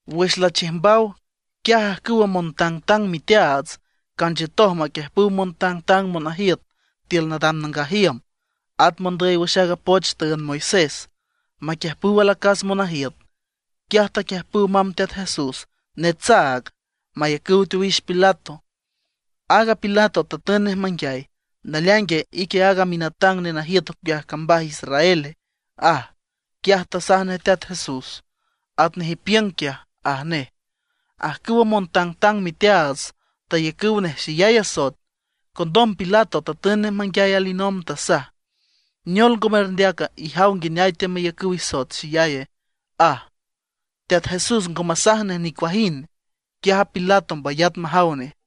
Wüx lachiüjmbaw, quiaj ajcüwa montangtang miteaats canchiütoj maquiüjpüw montangtang monajiüt tiül nadam nangaj iüm, at mondüy wüx aaga poch tüünd Moisés, maquiüjpüw alacas monajiüt. Quiaj taquiüjpüw mamb Teat Jesús netsaag, mayacüw teowix Pilato. Aaga Pilato tatün nej manguiay: ―¿Naleaingue, ique aaga minatang nenajiüt ocueaj cambaj Israele? ―aj. Quiaj tasaj nej Teat Jesús: ―Atnej ipiüng quiaj ―aj nej. Ajcüwa montangtang miteaats tayacüw nej xeyay asoet. Condom Pilato tatün nej manguiay alinomb, tasaj: ―¿Neol ngo merndeaca? Ijaw nguineay teamayacüw isoet xeyay ―aj. Teat Jesús ngo masaj nej nicuajind, quiaj a Pilato mbayat majaw nej.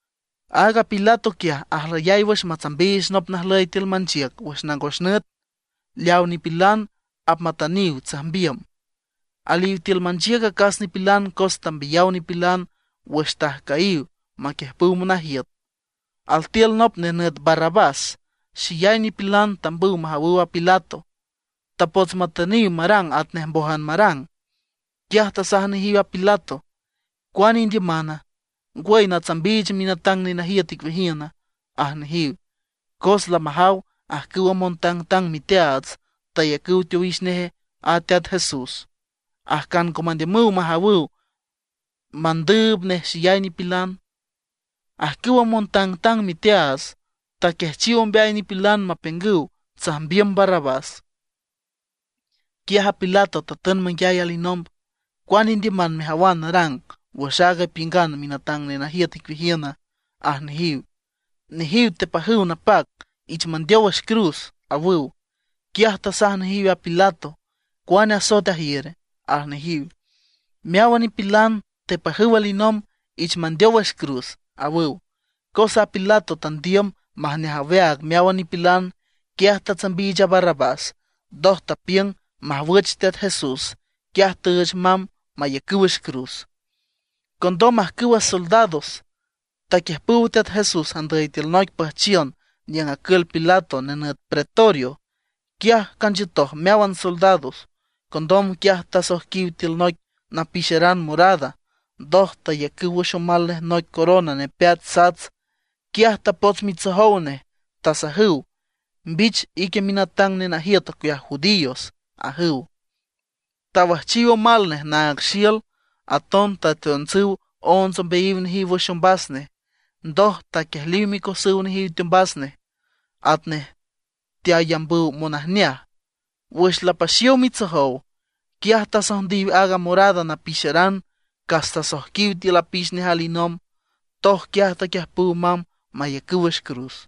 Aaga Pilato quiaj ajlüyay wüx matsambiich nop najlüy tiül manchiüc wüx nangos nüt, leaw nipilan apmatüniw tsajmbiüm. Aliw tiül manchiüc acas nipilan cos tambiyaw nipilan wüx tajcüyiw maquiüjpüw monajiüt. Altiül nop nenüt Barrabás. Xeyay nipilan tambüw majawüw a Pilato. Tapots matüniw marang atnej mbójan marang. Quiaj tasaj nejiw a Pilato: ―¿Cuane indiümana? ¿Ngwüy, sanatsambiich minatang nenajiüt icueajiüna? ―aj nejiw. Cos lamajaw ajcüwa montangtang miteaats tayacüw teowix nej a Teat Jesús, ajcan ngo mandiümüw majawüw mandüüb nej xeyay nipilan. Ajcüwa montangtang miteaats taquiajchiw ombeay nipilan mapiüngüw tsajmbiüm Barrabás. Quiaj a Pilato tatün manguiay alinomb: ―¿Cuane indiüman mejawan narang wüx aag ipiüngan minatang nenajiüt icueajiüna? ―aj nejiw. Nejiw tepajüw napac: ―¡Ich mandeow wüx cruz! ―awüw. Quiaj tasaj nejiw a Pilato: ―¿Cuane asoet ajiür? ―aj nejiw. Meáwan nipilan tepajüw alinomb: ―¡Ich mandeow wüx cruz! ―awüw. Cos aaga Pilato tandiüm majneaj aweaag meáwan nipilan, quiaj tatsambiich a Barrabás. Ndoj tapiüng majwüch Teat Jesús, quiaj tüüch mamb mayacüw wüx cruz. Condom ajcüwa soldados taquiüjpüw Teat Jesús andüy tiül noic püjchiün niüng acül Pilato, nenüt pretorio. Quiaj canchiütoj meáwan soldados. Condom quiaj tasoijquiw tiül noic napixeran morada, ndoj tayacüw wüx omal nej noic corona nepeat sats. Quiaj tapots mitsojow nej, tasajüw: ―¡Mbich ique minatang nenajiüt ocueaj judíos! ―ajüw. Tawüjchiw omal nej naag xiül, aton tateontsüw onts ombeayiw nejiw wüx ombas nej. Ndoj taquiejliw micosüw nejiw teombas nej, atnej teayambüw monajneaj. Wüx lapaxiow mitsojow, quiaj tasojndiw aaga morada napixeran, cas tasoijquiw tiül apix nej alinomb. Ndoj quiaj taquiüjpüw mamb mayacüw wüx cruz.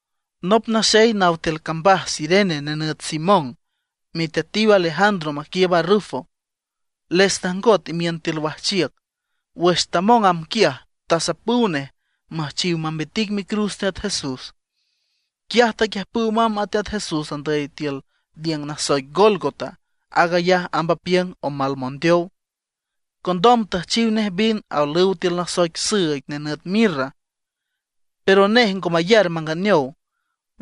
Nop naxey naw tiül cambaj Cirene, nenüt Simón, miteatiw Alejandro maquiiüb a Rufo, les tajngot imiün tiül wajchiüc. Wüx tamong amb quiaj, tasapüw nej müjchiw mambitic micruz Teat Jesús. Quiaj taquiüjpüw mamb a Teat Jesús andüy tiül niüng nasoic Gólgota, aag ayaj amb apiüng: Omal Mondeow. Condom tüjchiw nej vin aolüw tiül noic süüig nenüt mirra, pero nej ngo mayar manganeow.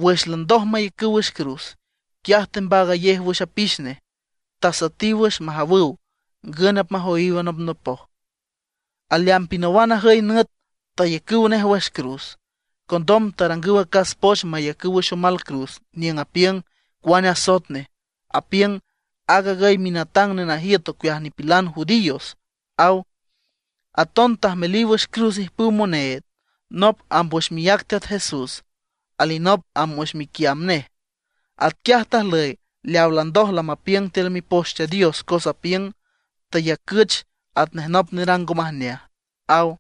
Wüx landoj mayacüw wüx cruz, quiaj tembaagayej wüx apix nej. Tasüetiw wüx majawüw ngün apmajoyiw anopnopoj. Aleamb pinawan ajüy nüt tayacüw nej wüx cruz. Condom tarangüw acas poch mayacüw wüx omal cruz niüng apiüng cuane asoet nej. Apiüng: “Aag agüy minatang nenajiüt ocueajiw nipilan judío”, aw. Aton tajmeliw wüx cruz ijpüw moneed, nop amb wüx miác Teat Jesús, alinop amb wüx miquiamb nej. Atquiaj tajlüy leaw landoj lamapiüng tiül Mipoch Teat Dios, cos apiüng: “Tayacüch atnej nop nerang ngo majneaj”, aw.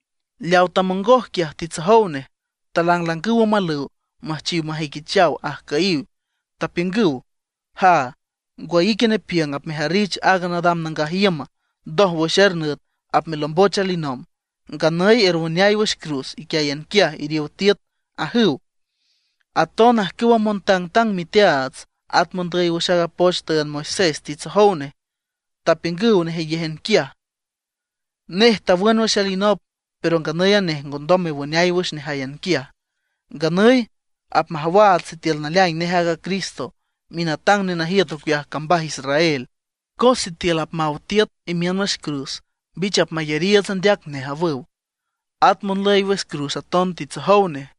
Leaw tamongoj quiaj titsojow nej, talanglangüw omalüw müjchiw majüiquichaw ajcüyiw. Tapiüngüw: ―¡Jaa, ngwüy ique nepiüng apmejarrich aag nadam nangaj iüm, ndoj wüx er nüt apmelomboch alinomb! ¡Nganüy erwüneay wüx cruz iquiáyan quiaj, iriow tiüt! ―ajüw. At aton ajcüwa montangtang miteaats at mondüy wüx aaga poch tüünd Moisés titsojow nej, tapiüngüw nejeyéjan quiaj: ―Nej tawün wüx alinop, pero nganüy a nej ngondom mewüneay wüx nejáyan quiaj. Nganüy apmajawaats sitiül naleaing nej aaga Cristo, minatang nenajiüt ocueaj cambaj Israel, cos sitiül apmaw tiüt imiün wüx cruz, mbich apmayariiüts andeac nej ―awüw. At monlüy wüx cruz aton titsojow nej.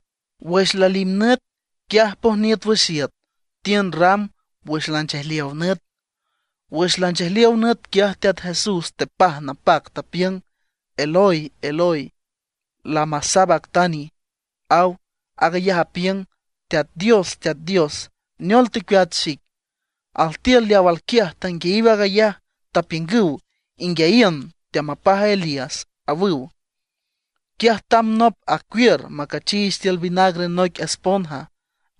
Wüx lalimnüt, quiaj pojniüt wüx iüt, tiün ram wüx lanchejliow nüt. Wüx lanchejliow nüt, quiaj Teat Jesús tepaj napac, tapiüng: ―Eloi, Eloi, ¿lama sabactani? ―aw. Aag ayaj apiüng: Teat Dios, Teat Dios, ¿neol tecueat xic? Altiül leaw alquiaj tanguiayiw aag ayaj, tapiüngüw: ―Inguiayiün, teamapaj a Elías ―awüw. Quiaj tamb nop, acuiür macachiich tiül vinagre noic esponja,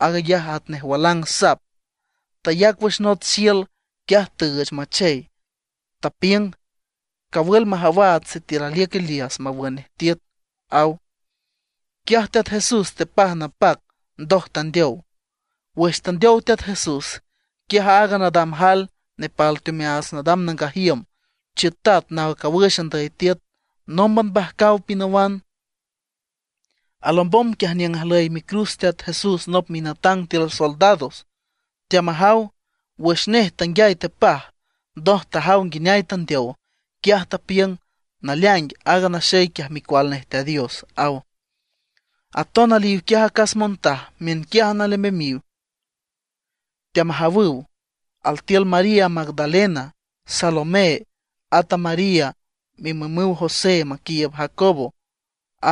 aag ayaj atnej walang sap. Tayac wüx nots xiül. Quiaj tüüch machey. Tapiüng: ―Cawül majawaats sitiül aliüc Elías mawün nej tiüt ―aw. Quiaj Teat Jesús tepaj napac, ndoj tandeow. Wüx tandeow Teat Jesús, quiaj aaga nadam jael nepal teomeaats nadam nangaj iüm chiütat naw cawüx andüy tiüt, nómban mbajcaw pinawan. Alombom quiaj niüng ajlüy micruz Teat Jesús nop minatang tiül soldados, teamajaw. Wüx nej tanguiay tepaj, ndoj tajaw nguineay tandeow, quiaj tapiüng: ―¡Naleaing aaga naxey quiaj Micual nej Teat Dios! ―aw. Aton aliw quiaj acas montaj, miünquiájan alembemiw teamajawüw. Altiül María Magdalena, Salomé, at a María mimümuw José maquiiüb Jacobo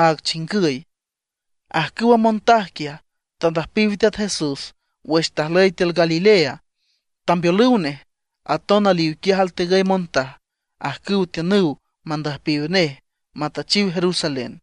aag chingüy. Ajcüwa montaj quiaj, tandüjpiw Teat Jesús wüx tajüy tiül Galilea, tambeolüw nej. Aton aliw quiaj altigüy montaj, ajcüw tiünüw mandüjpiw nej matüchiw Jerusalén.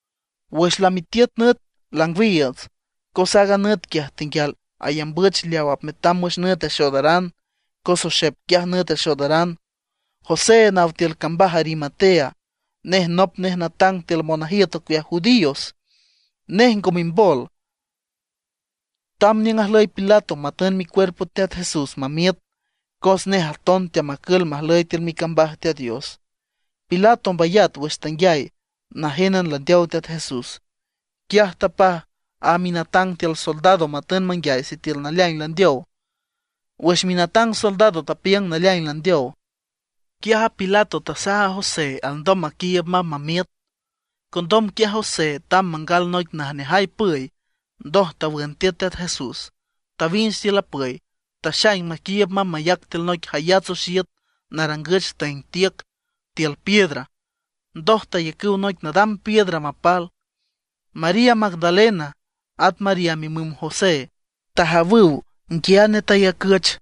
Wüx lamitiüt nüt, langwiiüts, cos aaga nüt quiaj tenguial ayambüch leaw apmetam wüx nüt axoodaran, cos oxep quiaj nüt axoodaran. José naw tiül cambaj Arimatea, nej nop nej natang tiül monajiüt ocueaj judíos. Nej ngo mimbol, tamb niüng ajlüy a Pilato matün micuerpo Teat Jesús mamiüt. Cos nej aton teamacül majlüy tiül micambaj Teat Dios. Pilato mbayat wüx tanguiay najénan landeow Teat Jesús. Quiaj tapaj a minatang tiül soldados matün manguiay sitiül naleaing landeow. Wüx minatang soldado tapiüng naleaing landeow, quiaj a Pilato tasaj a José alndom maquiiüb mamb mamiüt. Condom quiaj José tamb mangal noic najneaj püy. Ndoj tawün tiüt Teat Jesús, tawinch tiül a püy, taxaing maquiiüb mamb mayac tiül noic jayats oxiüt narangüch tüeng tiüc tiül piedra. Ndoj tayacüw noic nadam piedra mapal. María Magdalena, at María mimüm José, tajawüw nguiane tayacüch.